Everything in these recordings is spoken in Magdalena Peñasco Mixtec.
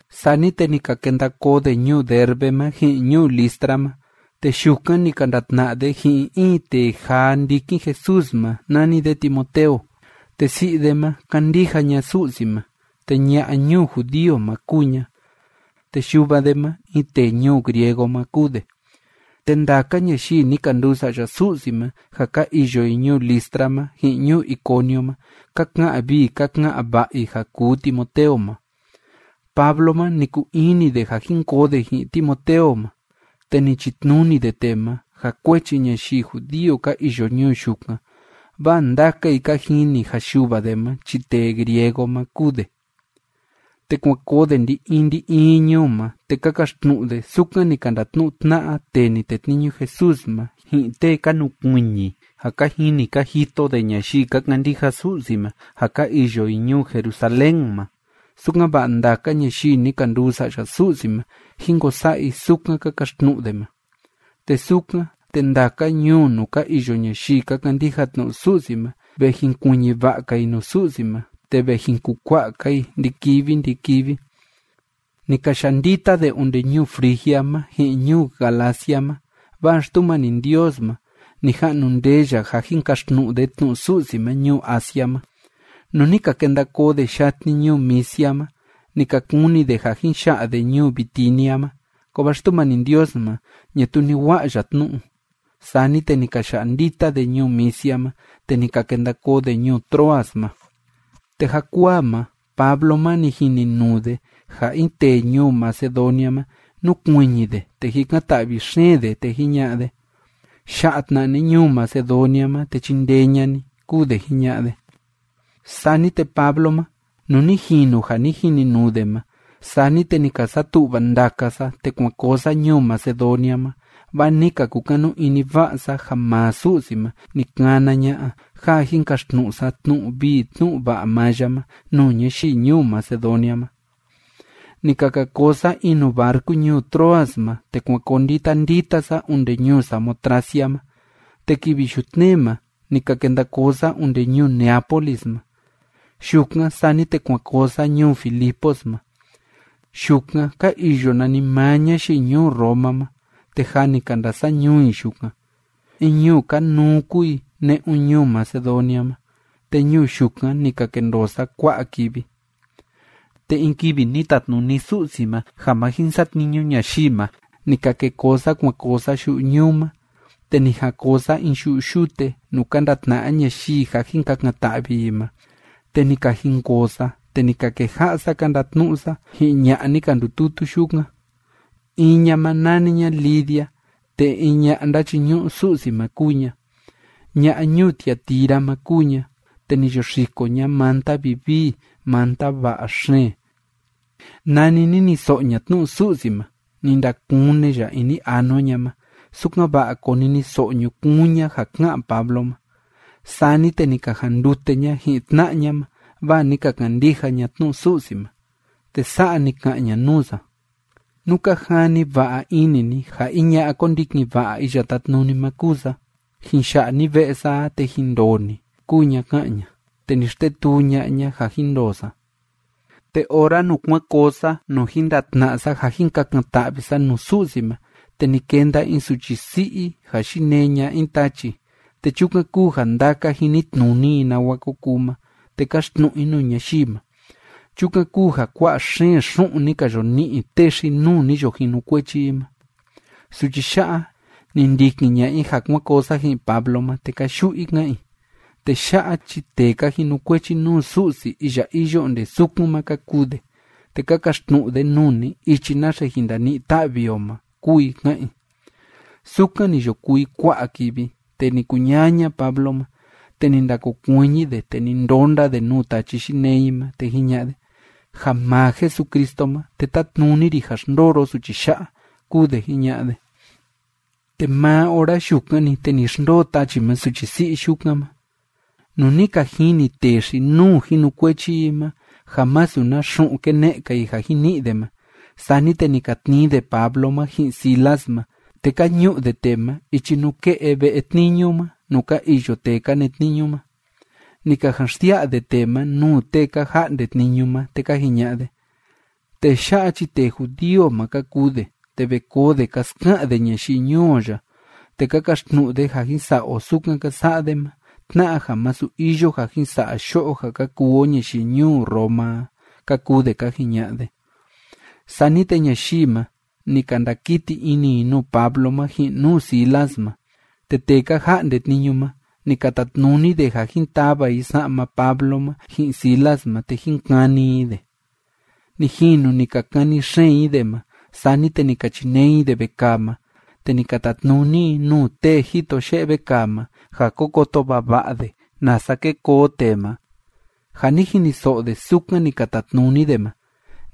Sani te ni ka kenda koo de ñuu Derbe ma ji'in ñuu Listra ma, te yukan ni ka ndatna'a de ji'in in tee jaa ndikin Jesús ma nani de Timoteo. Te si'i de ma, kándija ña Su'si ma, te ña'a ñuu judío ma kúu ña, te yuva de ma, in tee ñuu griego ma kúu de. Te ndaka ñayii ni ka nduu sa'ya Su'si ma ja ka iyo i ñuu Listra ma, ji'in ñuu Iconio ma, ka ka'an vii ka ka'an va'a i ja kuu Timoteo ma. Pablo ma, ni kuu ini de ja jin koo de ji'in Timoteo ma, te ni chitnuni de tee ma, ja kuechi ñayii judío ka iyo ñuu yukan, vaa ndaka i ka jini ja yuva de ma chi tee griego ma kúu de. Te kuan koo de ndi‑in ndi‑in ñuu ma, te ka kaxtnu'u de sukan ni ka ndatnu'u tna'a tee ni tetniñu Jesús ma, ji'in tee ka nukuiñi ja ka jini ka jito de ñayii ka kandija Su'si ma ja ka iyo i ñuu Jerusalén ma, sukan‑va'a ndaka ñayii ni ka nduu sa'ya Su'si ma, jín ko sa'a i sukan ka kaxtnu'u de ma. Te sukan, te ndaka ñuu nuu ka iyo ñayii ka kandija tnu'u Su'si ma, ve jinkuiñi va'a‑ka i nuu Su'si ma, te ve jin kukua'a‑ka i ndi‑kivi ndi‑kivi. Ni ka ya'a ndita de onde ñuu Frigia ma, ji'in ñuu Galacia ma, vaa Xtumani Ndios ma, ni ja'nu ndee ya ja jin kaxtnu'u de tnu'u Su'si ma ñuu Asia ma. Nuu ni ka kenda koo de yatni ñuu Misia ma, ni ka kuni de ja jin ya'a de ñuu Bitinia ma, kovaa Xtumani Ndios ma, ñatuu ni wa'a ya tnu'u. Sani te ni ka ya'a ndita de ñuu Misia ma, te ni ka kenda koo de ñuu Troas ma. Te jakuaa ma, Pablo ma, ni jininuu de ja in tee ñuu Macedonia ma, núkuiñi de, te jikan‑ta'vi xeen de, te jiña'a de: ―Ya'a tna ni ñuu Macedonia ma, te chindee ña'a ni ―kúu de jiña'a de. Sani te Pablo ma, nuu ni jinu ja ni jininuu de ma, sani te ni ka satu'va ndaka sa, te kuan koo sa ñuu Macedonia ma, vaa ni ka kukanu ini va'a sa ja maa Su'si ma ni kana ña'a ja jin kaxtnu'u sa tnu'u vii tnu'u va'a maa ya ma nuu ñayii ñuu Macedonia ma. Ni ka ka koo sa in nuu barcu ñuu Troas ma, te kuan koo ndita ndita sa onde ñuu Samotracia ma, te kivi yutnee ma ni ka kenda koo sa onde ñuu Neápolis ma. Yukan, sani te kuan koo sa ñuu Filipos ma. Yukan ka iyo nanimaa ñayii ñuu Roma ma, te jâ ni ka ndasa'a ñuu i yukan. In ñuu kanuu kúu i ne'un ñuu Macedonia ma. Te ñuu yukan ni ka kendoo sa kua'a kivi. Te in kivi ni tatnuni Su'si ma ja ma jin satniñu ñayii ma, ni ka ke koo sa kuan koo sa yu'u ñuu ma, te ni jan koo sa in yu'u yute, nuu ka ndatna'a ñayii ja jin kakan‑ta'vi i ma. Te ni ka jinkoo sa, te ni ka keja'a sa ka ndatnu'u sa ji'in ña'a ni ka ndututu yukan. In ña ma, nani ña Lidia, te in ña'a ndachiñu'u Su'si ma kúu ña. Ña'a ñuu Tiatira ma kúu ña, te ni yo xiko ña manta vivii manta va'a xeen. Nani niniso'o ña tnu'u Su'si ma, ni ndakune ya ini anua ña ma, sukan‑va'a koniniso'o ñukuun ña ja ká'an Pablo ma. Sani te ni ka jandute ña ji'in tna'a ña ma, vaa ni ka kandija ña tnu'u Su'si ma, te sa'a ni ka'an ña nuu sa: ―Nú ka jani va'a ini ni ja in ña'a kondikin va'a Iya Tátnuni ma kúu sa, jin ya'a ni ve'e sa a, te jin ndoo ni ―kúu ña ká'an ña. Te ni xtetuu ña'a ña ja jin ndoo sa. Te ora nuu kuan koo sa nuu jin ndatna'a sa ja jin kakan‑ta'vi sa nuu Su'si ma, te ni kenda in suchi si'i ja yinee ña'a in tachi, te chukan kúu ja ndaka jinitnuni i nawa ko kuu ma, te káxtnu'u i nuu ñayii ma. Chukan kúu ja kua'a xeen xu'un ni ka yo ni'i tee xi‑nuu ni yo jinukuechi i ma. Suchi ya'a, ni ndikin ña'a i ja kuan koo sa ji'in Pablo ma, te káyu'u i ká'an i: ―Tee ya'a chi tee ka jinukuechi nuu Su'si iya iyo onde sukun ma ka kuu de, te ka kaxtnu'u de nuu ni ichi naxe jin ndani'i ta'vi o ma ―kúu i ká'an i. Sukan ni yo kuu i kua'a kivi, te ni kuñaña Pablo ma, te ni ndakokuiñi de, te ni ndonda de nuu tachi yinee i ma, te jiña'a de: ―Ja maa Jesucristo ma, te tátnuni ri ja xndoo ro suchi ya'a ―kúu de jiña'a de. Te maa ora yukan‑ni, te ni xndoo tachi ma suchi si'i yukan ma. Nuu ni ka jini tee xi‑nuu jinukuechi i ma ja masu na xu'un kene'e‑ka i ja jin ni'i de ma, sani te ni ka tnii de Pablo ma ji'in Silas ma, te ka ñu'u de tee ma ichi nuu ke'e ve'e tniñu ma nuu ka iyo tee ka netniñu ma. Ni ka jan xsia'a de tee ma nuu tee ka ja'nde tniñu ma, te ka jiña'a de: ―Tee ya'a chi tee judío ma ka kuu de, te ve koo de ka ska'an de ñayii ñuu o ya, te ka kaxtnu'u de ja jin sa'a o sukan ka sa'a de ma, tna'a ja masu iyo ja jin sa'a yo'o ja ka kuu o ñayii ñuu Roma a ―ka kuu de ka jiña'a de. Sani te ñayii ma, ni ka ndakiti ini i nuu Pablo ma ji'in nuu Silas ma, te tee ka ja'nde tniñu ma, ni ka tatnuni de ja jin tava i sa'ma Pablo ma ji'in Silas ma te jin kani i de. Ni jinu ni ka kani xeen i de ma, sani te ni ka chinee i de vekaa ma, te ni ka tatnuni i nuu tee jito ye'e vekaa ma ja ko koto vava'a de nasa ke koo tee ma. Ja ni jiniso'o de sukan ni ka tatnuni de ma,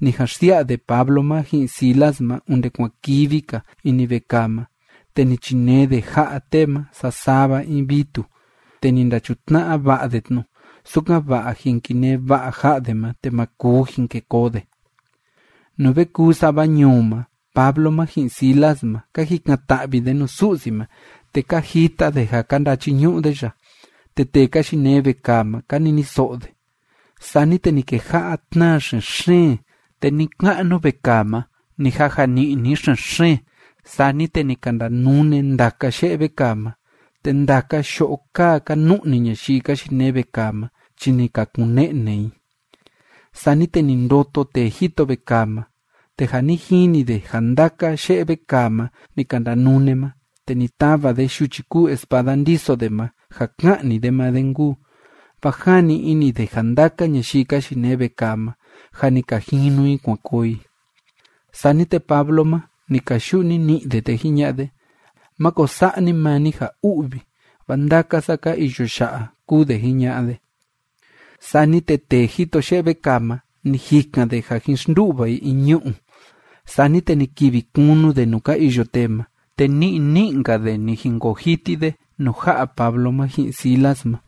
ni jan xsia'a de Pablo ma ji'in Silas ma onde kuan kivi‑ka ini vekaa ma, te ni chinee de ja'a tee ma sasava in vitu, te ni ndachutna'a va'a de tnu, sukan‑va'a jin kinee va'a ja'a de ma, te ma kuu jin ke koo de. Nuu ve kuu sava ñuu ma, Pablo ma ji'in Silas ma, ka jikan‑ta'vi de nuu Su'si ma, te ka jita de ja ka ndachiñu'u de ya, te tee ka yinee vekaa ma, ka niniso'o de. Sani te ni keja'a tnaa xen‑xeen, te ni‑ka'nu vekaa ma ni jaja ni'ni xen‑xeen. Sani te ni ka ndanune ndaka ye'e vekaa ma, te ndaka yo'o kaa ka nu'ni ñayii ka yinee vekaa ma chi ni ka kun‑ne'ne i. Sani te ni ndoto tee jito vekaa ma, te ja ni jini de ja ndaka ye'e vekaa ma ni ka ndanune ma, te ni tava de yuchi kúu espada ndiso de ma, ja ka'ni de maa de nkuu, vaa jani ini de ja ndaka ñayii ka yinee vekaa ma, jâ ni ka jinu i kuan koo i. Sani te Pablo ma, ni kayu'u nini'i de, te jiña'a de: ―Máko sa'a ni maa ni ja u'vi, vaa ndaka sa ka iyo ya'a ―kúu de jiña'a de. Sani te tee jito ye'e vekaa ma, ni jikan de ja jin xndu'va i in ñu'u. Sani te ni kivi kunu de nuu ka iyo tee ma, te ni'i ni'i‑nka de ni jinkoo jiti de nuu ja'a Pablo ma ji'in Silas ma.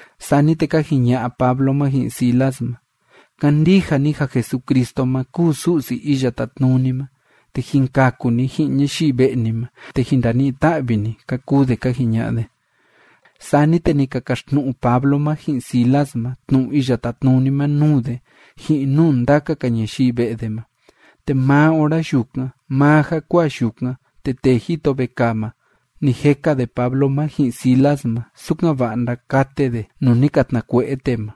Sani te ka jiña'a Pablo ma ji'in Silas ma: ―Kandija ni ja Jesucristo ma kúu Su'si Iya Tátnuni ma, te jin kaku ni ji'in ñayii ve'e ni ma, te jin ndani'i ta'vi ni ―ka kuu de ka jiña'a de. Sani te ni ka kaxtnu'u Pablo ma ji'in Silas ma tnu'u Iya Tátnuni ma nuu de, ji'in nuu ndaka‑ka ñayii ve'e de ma. Te maa ora yukan, maa jakuaa yukan, te tee jito vekaa ma, ni jeka de Pablo ma ji'in Silas ma, sukan‑va'a ndakate de nuu ni ka tnakue'e tee ma.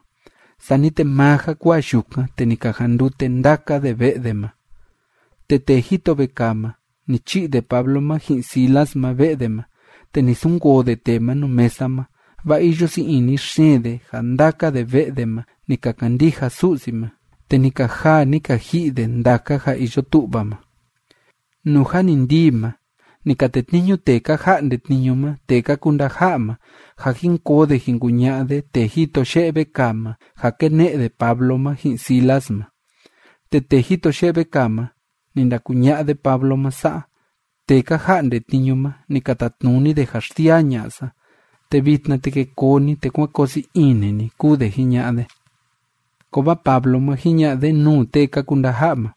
Sani te maa jakuaa yukan, te ni ka jandute ndaka de ve'e de ma. Te tee jito vekaa ma, ni chi'i de Pablo ma ji'in Silas ma ve'e de ma, te ni sunkoo de tee ma nuu mesa ma, vaa iyo sii ini xeen de ja ndaka de ve'e de ma ni ka kandija Su'si ma, te ni ka jaa ni ka ji'i ndaka de ja iyo tu'va ma. Nuu jâ ni ndii ma, ni ka tetniñu tee ka ja'nde tniñu ma tee ka kuu ndaja'a ma ja jin koo de jin kuña'a de tee jito ye'e vekaa ma ja kene'e de Pablo ma ji'in Silas ma. Te tee jito ye'e vekaa ma, ni ndakuña'a de Pablo ma sa'a: ―Tee ka ja'nde tniñu ma, ni ka tatnuni de ja xsiaa ña'a sa. Te vitna, te ke koo ni, te kuán koo sii ini ni ―kúu de jiña'a de. Kovaa Pablo ma, jiña'a de nuu tee ka kuu ndaja'a ma: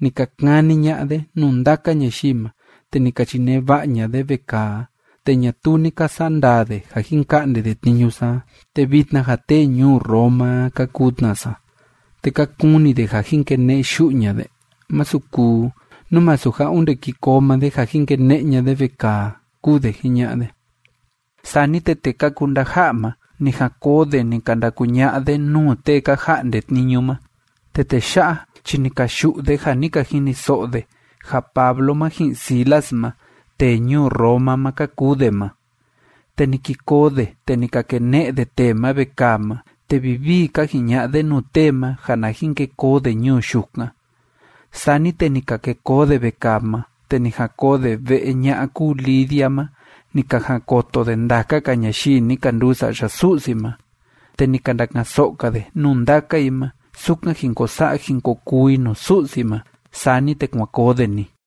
―Ni ka kani ña'a de nuu ndaka ñayii ma, te ni ka chinee va'a ña'a de vekaa a, te ñatuu ni ka sa'a ndaa de ja jin ka'nde de tniñu sa a, te vitna ja tee ñuu Roma a ka kuu tna sa. ¿Te ka kuni de ja jin kene'e yu'u ña'a de? Masu kuu, nú masu ja onde ki koo maa de ja jin kene'e ña'a de vekaa a ―kúu de jiña'a de. Sani te tee ka kuu ndaja'a ma, ni jan koo de ni ka ndakuña'a de nuu tee ka ja'nde tniñu ma, te tee ya'a chi ni ka yu'u de ja ni ka jiniso'o de ja Pablo ma ji'in Silas ma, tee ñuu Roma ma ka kuu de ma. Te ni ki koo de, te ni ka kene'e de tee ma vekaa ma, te vivii ka jiña'a de nuu tee ma ja na jin ke koo de ñuu yukan. Sani te ni ka ke koo de vekaa ma, te ni jan koo de ve'e ña'a kúu Lidia ma ni ka jan koto de ndaka‑ka ñayii ni ka nduu sa'ya Su'si ma. Te ni ka ndaka'an‑so'o‑ka de nuu ndaka i ma sukan jin ko sa'a jin ko kuu i nuu Su'si ma. Sani te kuan koo de‑ni.